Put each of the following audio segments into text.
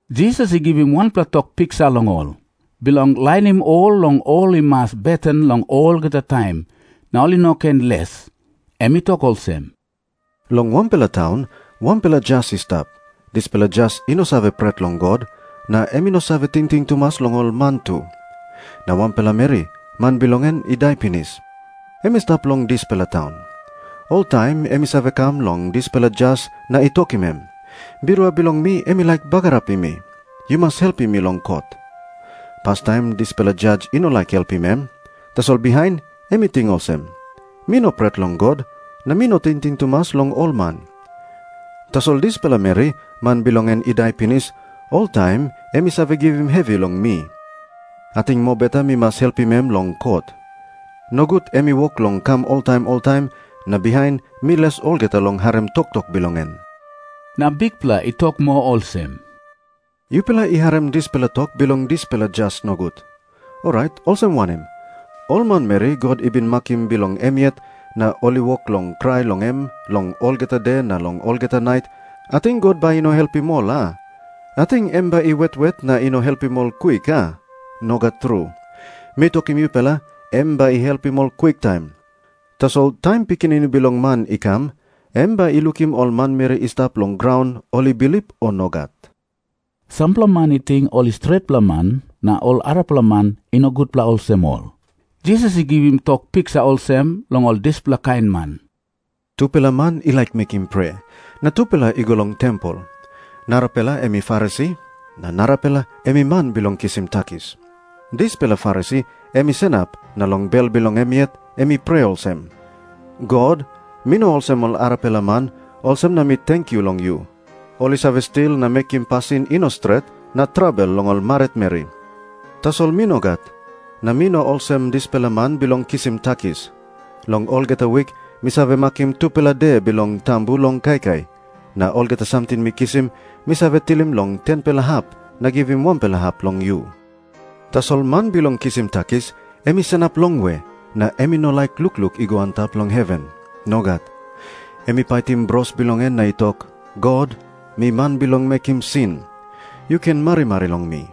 Jisas i givim wanpela tok piksa long ol, bilong lainim ollong ol i mas beten long olgeta taim, na ol i no ken les. Em i tok olsem, “Long wanpela taun, wanpela jas i stap. Dispela jas i no save pret long God, na em i no save tingting tumas long ol man tu. Na wanpela meri, man bilong en i dai pinis, em i stap long dispela taun. Oltaim em i save kam long dispela jas na i tokim em, ‘Birua bilong mi em i laik bagarapim mi. Yu mas helpim mi long kot.’ Pastaim dispela jas i no laik helpim em. Tasol bihain em i ting olsem, ‘Mi no pret long God, na mi no tingting tumas long ol man. Tasol dispela meri, man bilong en i dai pinis, oltaim em i save givim hevi long mi. Ating mobeta mi mas helpim em long kot. Nogut em i wok long kam oltaim oltaim, na bihain mi les olgeta long harim toktok bilong en.’” Na Bikpela i tok moa olsem, “Yupela i harim dispela tok bilong dispela jas nogut. Orait olsem wanem? Ol manmeri God i bin makim bilong em yet, na ol i wok long krai long em long olgeta de na long olgeta nait, ating God bai i no helpim ol, a? Ating em bai i wet wet na i no helpim ol kwik, a? Nogat tru. Mi tokim yupela, em bai i helpim ol kwiktaim. Tasol taim Pikinini Bilong Man i kam, em bai i lukim ol manmeri i stap long graun ol i bilip, o nogat?” Sampela man i ting ol i stretpela man na ol arapela man i no gutpela olsem ol. Jisas i givim tok piksa olsem long ol dispela kain man, “Tupela man i laik mekim prea, na tupela i go long tempel. Narapela em i Farisi. Na narapela em i man bilong kisim takis. Dispela Farisi em i sanap na long bel bilong em yet em i prea olsem, ‘God, mi no olsem ol arapela man, olsem na mi tenkyu long yu. Ol i save stil na mekim pasin i no stret na trabel long ol maritmeri. Tasol mi nogat. Na mi no olsem dispela man bilong kisim takis. Long olgeta wik mi save makim tupela de bilong tambu long kaikai. Na olgeta samting mi kisim, mi save tilim long 10-pela hap na givim wanpela hap long yu.’ Tasol man bilong kisim takis em i sanap longwe, na em i no laik lukluk i go antap long heven. Nogat. Em i paitim bros bilong en na i tok, ‘God, mi man bilong mekim sin. Yu ken marimari long mi.’”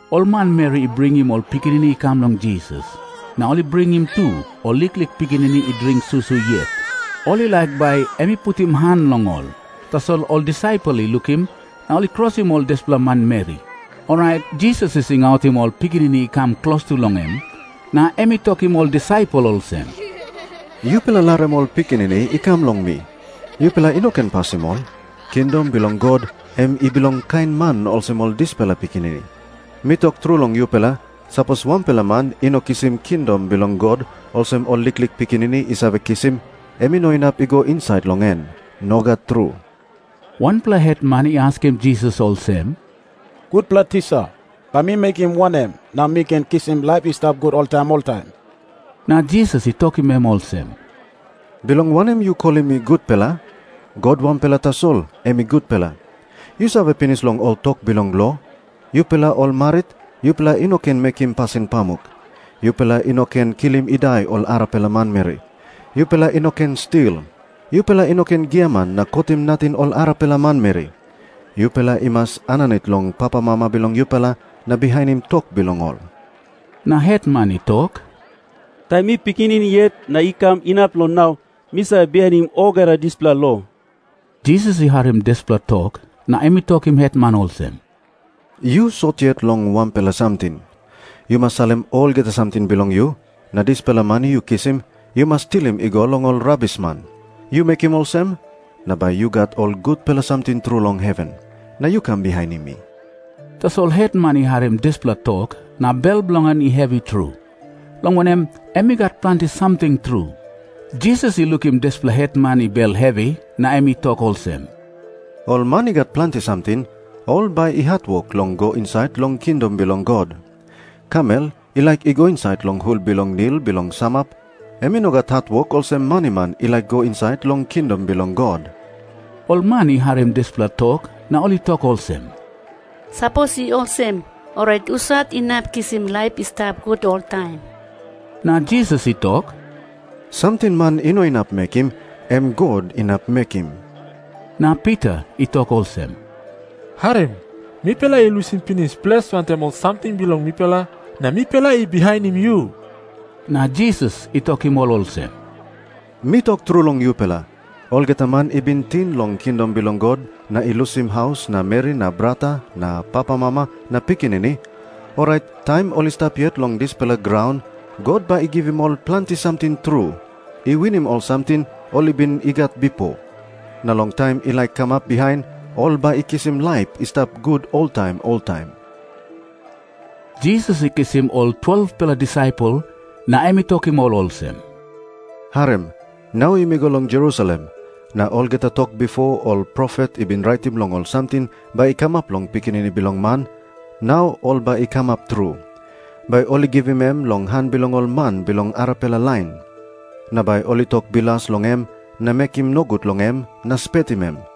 Ol manmeri i bringim ol pikinini i kam long Jisas, na ol i bringim tu ol liklik pikinini i dring susu yet. Ol i laik bai em i putim han long ol. Tasol ol disaipel i lukim, na ol i krosim ol dispela manmeri. Orait Jisas i singautim ol pikinini i kam klostu long em, na em i tokim ol disaipel olsem, “Yupela larim ol pikinini i kam long mi. Yupela i no ken pasim ol. Kingdom bilong God em i bilong kain man olsem ol dispela pikinini. Mi tok tru long yupela, sapos wanpela man i no kisim kingdom bilong God olsem ol liklik pikinini i save kisim, em i no inap i go insait long en. Nogat tru.” Wanpela hetman i askim Jisas olsem, “Gutpela tisa, bai mi mekim wanem na mi ken kisim laip i stap gut oltaim oltaim?” Na Jisas i tokim em olsem, “Bilong wanem yu kolim mi gutpela? God wanpela tasol em i gutpela. Yu save pinis long ol tok bilong lo, ‘Yupela ol marit, yupela i no ken mekim pasin pamuk. Yupela i no ken kilim i dai ol arapela manmeri. Yupela i no ken stil. Yupela i no ken giaman na kotim nating ol arapela manmeri. Yupela i mas aninit long papamama bilong yupela na bihainim tok bilong ol.’” Na hetman i tok, “Taim mi pikinini yet na i kam inap long nau, mi save bihainim olgeta dispela lo.” Jisas i harim dispela tok, na em i tokim hetman olsem, “Yu sot yet long wanpela samting. Yu mas salim olgeta samting bilong yu, na dispela mani yu kisim yu mas tilim i go long ol rabisman. Yu mekim olsem, na bai yu gat ol gutpela samting tru long heven. Na yu kam bihainim mi.” Tasol hetman i harim dispela tok, na bel bilong en i hevi tru, long wanem, em i gat planti samting tru. Jisas i lukim dispela hetman i bel hevi na em i tok olsem, “Ol man i gat planti samting, ol bai i hatwok long i go insait long kingdom bilong God. Kamel i laik i go insait long hul bilong nil bilong samap, em i no gat hatwok olsem maniman i laik i go insait long kingdom bilong God.” Ol man i harim dispela tok na ol i tok olsem, “Sapos i olsem, orait husat inap kisim laip i stap gut oltaim?” Na Jisas i tok, “Samting man i no inap mekim, em God inap mekim.” Na Pita i tok olsem, “Harim. Mipela i lusim pinis ples wantaim ol samting bilong mipela, na mipela i bihainim yu.” Na Jisas i tokim ol olsem, “Mi tok tru long yupela, olgeta man i bin ting long kingdom bilong God na i lusim haus na meri na brata na papamama na pikinini, orait taim ol i stap yet long dispela graun God bai i givim ol planti samting tru, i winim ol samting ol i bin i gat bipo. Na long taim i laik kamap bihain, ol bai i kisim laip i stap gut oltaim oltaim.” Jisas i kisim ol 12-pela disaipel na em i tokim ol olsem, “Harim. Nau yumi go long Jerusalem. Na olgeta tok bipo ol profet i bin raitim long ol samting bai i kamap long Pikinini Bilong Man, nau ol bai i kamap tru. Bai ol i givim em long han bilong ol man bilong arapela lain. Na bai ol i tok bilas long em na mekim nogut long em na spetim em.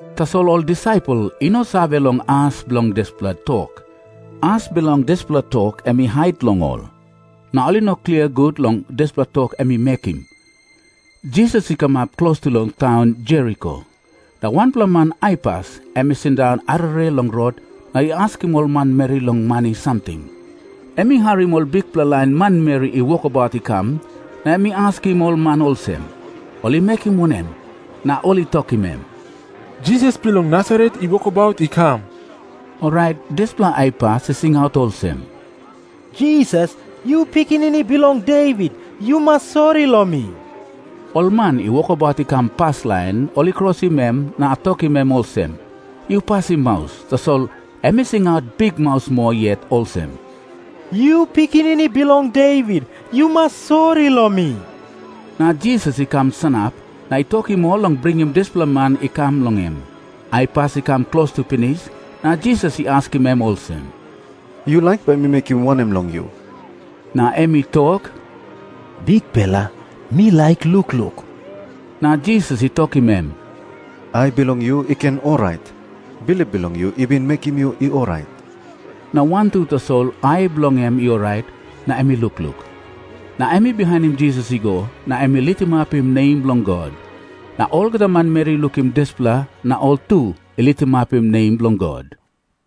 Tasol ol disaipel i no save long as bilong dispela tok. As bilong dispela tok em i hait long ol, na ol i no klia gut long dispela tok em i mekim. Jisas i kamap klostu long taun Jeriko, na wanpela man aipas em i sindaun arere long rot na i askim ol manmeri long mani samting. Em i harim ol bikpela lain manmeri i wokabaut i kam, na em i askim ol man olsem, “Ol i mekim wanem?” Na ol i tokim em, “Jisas bilong Nasaret i wokabaut i kam.” Orait dispela aipas i singaut olsem, “Jisas, yu Pikinini Bilong Devit, yu mas sori long mi.” Ol man i wokabaut i kam paslain ol i krosim em na tokim em olsem, “Yu pasim maus.” Tasol em i singaut bikmaus moa yet olsem, “Yu Pikinini Bilong Devit, yu mas sori long mi.” Na Jisas i kam sanap na i tokim ol long bringim dispela man i kam long em. Aipas i kam klostu pinis, na Jisas i askim em olsem, “Yu laik bai mi mekim wanem long yu?” Na em i tok, “Bikpela, mi laik lukluk.” Na Jisas i tokim em, “Ai bilong yu i ken i orait. Bilip bilong yu i bin mekim yu i orait.” Na wantu tasol ai bilong en i orait na em i lukluk. Na em i bihainim Jisas i go, na em i litimapim nem bilong God. Na olgeta manmeri i lukim dispela, na ol tu i litimapim nem bilong God.